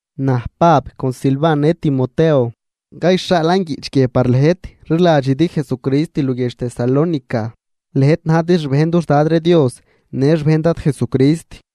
Naj, Pab con Silvan në Timoteo, cayxhaalan guiꞌch guie par lëjt rliladxidi Jesucrist luguiedx Tesalónica, lëjt najdi xbejn dux Dad ree Dios në xbejn Dad Jesucrist.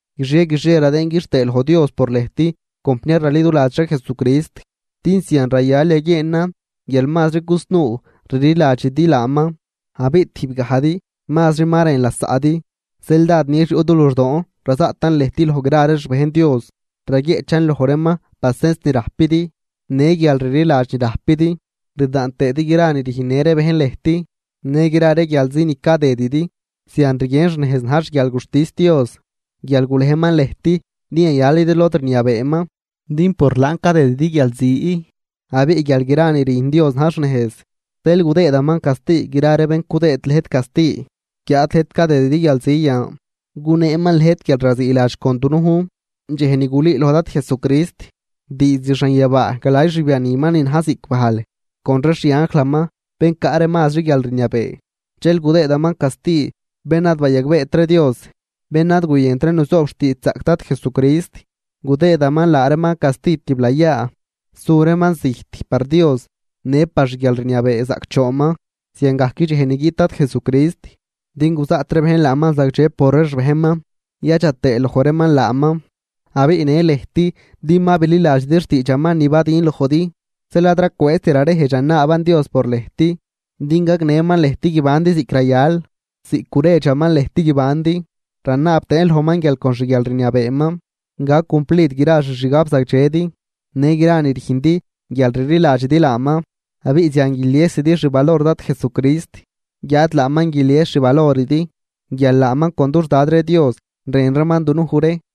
Guixie guixie radëën quixtëë loj Dios por lëjt compniar raliduladx ree Jesucrist, din zian rayal yaguieenan guial mazri cusnuu rliladxidi laaman, abiꞌ tijb gajdi mazri ma rën lasaꞌdi. Zeel dád nix yuꞌ du luxdoon razaꞌtan lëjt loj gra ree xbejn Dios, raguieꞌchan loj reeman pacens ni rajpidi në guialrliladx ni rajpidi, rdaan tëëdi gra ree ni rüjnnë ree bejn lëjt në gra ree guialzi ni cadëdidi. Zian rguien xnejz na̱j xguialguxtis Dios, guial gulejman lëjt din yayalidi lod rniabeeman, din por laan cadëdidi guialzi. Abiꞌ guial gra ni rüjn Dios na̱j xnejz, zeel gudëëdaman casti gra ree bén cudëëd lëjt casti. Guiáad lëjt cadëdidi guialzi yan, guneeman lëjt guialraziiladx con dunujn, dxej ni gulüüloj Dad Jesucrist diizd xanyabaa galay xbianiman ni na̱j ziꞌc bajl, con ree xianjlaman bén caꞌ ree mazri guialrniabee. Dxel gudëëdaman casti bén ad bayagbeet ree Dios, bén ad guyënt ree nuzoob xtiidxzaꞌc Dad Jesucrist. Gudëëdaman laa reeman casti tiblayaa, su reeman zijt par Dios në par xguialrniabee zaꞌcdxoonman. Zian gac dxej ni guiꞌt Dad Jesucrist, din guzaꞌt ree bejn laaman zagdxe por ree xbejnman, yadxa tëë loj gra reeman laaman, abiꞌ në lëjt, din ma bililadxidi xtiidxaman ni badün lojdi. Zeel ad racwëëzt rarejdx ranaaban Dios por lëjt din gagnëman lëjt guibandi ziꞌc rayal, ziꞌc guredxaman lëjt guibandi. Ranaab tëën lojman guial con xguialrniabeeman gac cumplid gra xixgabzagdxedi në gra ni rüjndi guial rliladxidi laaman. Abiꞌ zian guiliesidi xvalor Dad Jesucrist, guiáad laaman guilies xvaloridi guial laaman con dux Dad ree Dios rën reeman dunuj ree.